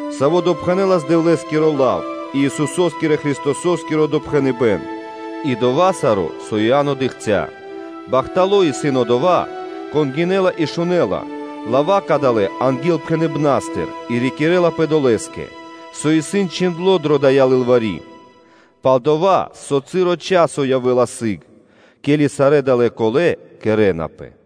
саво́ пхэнэлас зорья́са Дэвлэ́скиро лав и Исусо́скиро Христосо́скиро допхэныбэ́н и дова́ саро́, со Иа́но дыкхця́. Бахтало́ исын одова́, кон гинэ́ла и шунэ́ла лава́ кадалэ́ ангилпхэныбна́стыр и рикирэ́лапэ долэ́скэ, со исын чхиндло́ дро дая́ лылвари́, пал-дова́ со часо явэ́ла сыг, ке́ли сарэ́ далэ́ чачипэна́ кэрэ́напэ.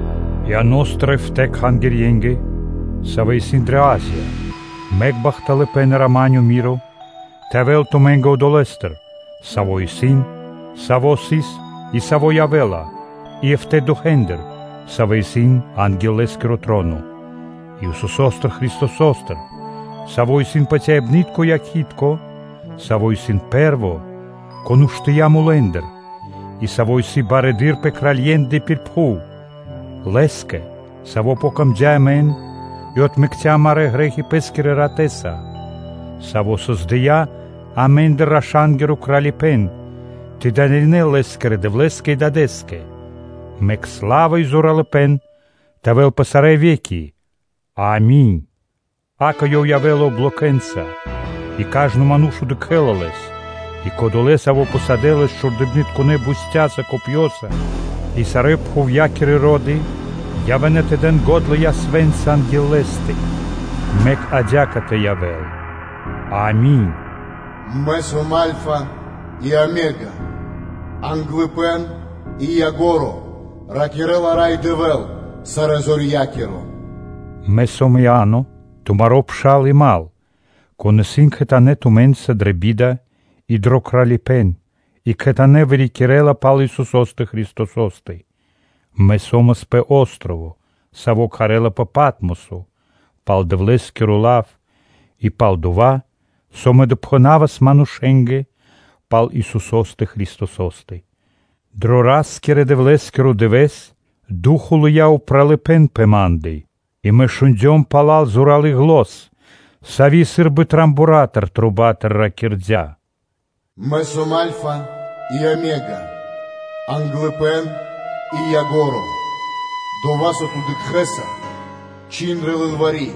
Иано́стыр эфта́ (битринэнгирэ дэшэ) кхангирье́нгэ, савэ́ исын дрэ Азия: Мэк бахталыпэ́н и рама́нё (миро) тэ явэ́л тумэ́нгэ Одолэ́стыр, Саво́ исын, Саво́ сыс, и Саво́ явэ́ла, и эфта́ духэ́ндыр, савэ́ исын анги́л Лэ́скиро троно; и Исусо́стыр Христосостыр, Саво́ исын патяибны́тко Якхи́тко (Свидетелё), Саво́ исын Пэ́рво, кон уштыя́ мулэ́ндыр и Саво́ исын Барыдыро́ пэ кралье́ндэ пир пхув. Лэ́скэ, Савэ́скэ яця́м дро́га амэ, Ёв отмэкця́ амарэ́ грэ́хи Пэ́скирэ ратэ́са, Саво́ создыя́ амэ́ндыр раша́нгиро Кралипэ́н тэ дынаринэ́л Лэ́скирэ Дэвлэ́скэ и Дадэ́скэ, мэк сла́ва и зоралыпэ́н тэ явэ́л пэ сарэ́ ве́ки. Ами́нь. Акэ, Ёв явэ́ла облокэ́нца, и кажно (сва́ко) ману́ш удыкхэ́ла Лэс, и кодолэ́, савэ́ пхусадэ́ Лэс чхурдыбнытконэ бустяса (копьёса) и сарэ́ пхувья́кирэ ро́ды явэ́на тэ дэн го́дла ясвэ́нца анги́л Лэ́стэ. Мэк адя́кэ тэ явэ́л. Ами́нь.” “Мэ сом Альфа и Омега, Англыпэ́н и Ко́нцо (Яго́ро), ракирэ́ла Рай Дэвэ́л, Сарэзорья́киро.” Мэ сом Иа́но, тумаро́ пшал, и мал (дру́го), кон исын кхэтанэ́ тумэ́нца дрэ би́да и дро кралипэ́н и кхэтанэ́ вырикирэ́ла пал Исусо́стэ Христосо́стэ. Мэ со́мас пэ о́строво (джип), саво́ кхарэ́лапэ “Патмосо” пал Дэвлэ́скиро лав и пал дова́, со мэ допхэна́вас манушэ́нгэ пал Исусо́стэ Христосо́стэ. Дро Ра́скирэ-Дэвлэ́скиро дывэ́с Ду́хо (Фа́но) лыя́ упралыпэ́н пэ ма́ндэ и мэ шундём пала́л зоралы́ зан, сави́ сы́рбы рого́стыр (труба́тыр) ракирдя́: “Мэ сом Альфа и Омега, Англыпэ́н и Ко́нцо (Яго́ро), дова́, со ту дыкхэ́са, чхин дрэ лылвари́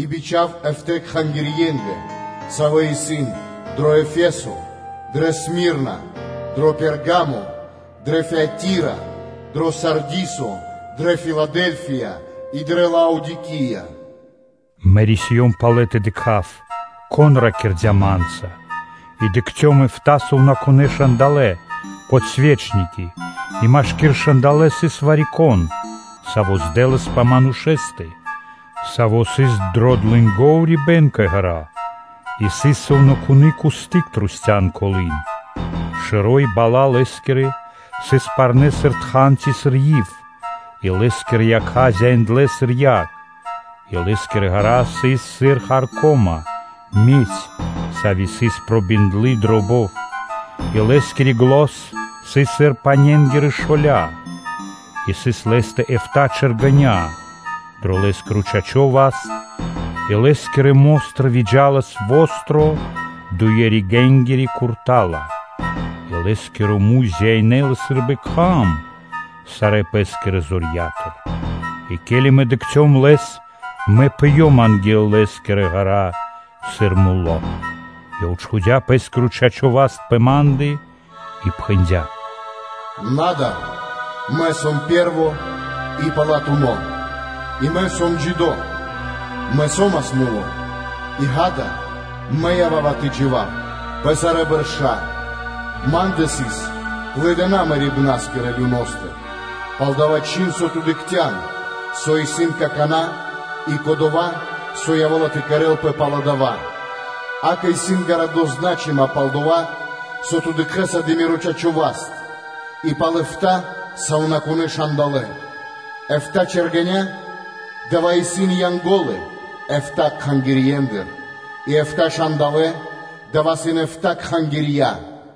и бичха́в эфта́ кхангирье́нгэ, савэ́ исын [кэ Асия-р.с.]: дро Ефесо, дрэ Смирна, дро Пергамо, дрэ Фиатира, дро Сардисо, дрэ Филадэльфия и дрэ Лаодикия.” Мэ рисиём палэ тэ дыкха́в, кон ракирдя́ ма́нца, и дыкхцём эфта́ сувнакунэ́ момолытка (светильники), и машки́р эфта́ момолытка сыс вари-кон, Саво́ здэласпэ (сыс похожо) пэ Манушэ́стэ, Саво́ сыс дро длэнго урибэ́н кэ ґэра́, и сыс сувнакуны́ кусты́к трусця́л (кругом) Лэ́стэ: шэро́ и бала́ Лэ́скирэ сыс парнэ́ сыр са́мо парно́ тхан ци сыр ив, и Лэ́скирэ якха́ зяиндлэ сыр яг; и Лэ́скирэ ґэра́ сыс сыр харко́ма (медь), сави́ сыс пробиндлы дро бов, и Лэ́скири зан сыс сыр бутэ́-паненгирэ шоля; и сыс Лэ́стэ эфта́ чэргэня́ дро Лэ́скиро чачо́ васт, и Лэ́скирэ мо́стыр выджа́лас востро (чолалы́) дуе́-ригэ́нгири курта́ла (мечо), и Лэ́скиро муй зяинэлас сы́рбы кхам сарэ́ пэ́скирэ зорья́тыр. И ке́ли мэ дыкхцём Лэс, мэ пыём анги́л Лэ́скирэ ґэра́ сыр муло́. Ёв чхудя́ Пэ́скиро чачо́ (пра́во) васт пэ ма́ндэ, и пхэндя́: “На дар! Мэ сом Пэ́рво и Палатуно́ (Последнё), Мэ сом джидо́: и Мэ со́мас муло́, и, ґа́да, Мэ ява́ва тэ джива́в пэ сарэ́ бэрша́, Ма́ндэ исын клыдына мэрибнаскирэ люностыр (адостыр). Палдава́ чхин (рандэ), со ту дыкхця́н, со исын какана́, и кодова́, со явэ́ла тэ кэрэ́лпэ пало́ дава́, акэ, исын гарады зна́чыма пал дова́, со ту дыкхэ́са дро миро чачо́ васт и пал эфта́ сувнакунэ́ момолытка: эфта́ чэргэня́-дава́ исын Янго́лы эфта́ кхангирьендыр, и эфта́ момолытка-дава́ исын эфта́ кхангирья.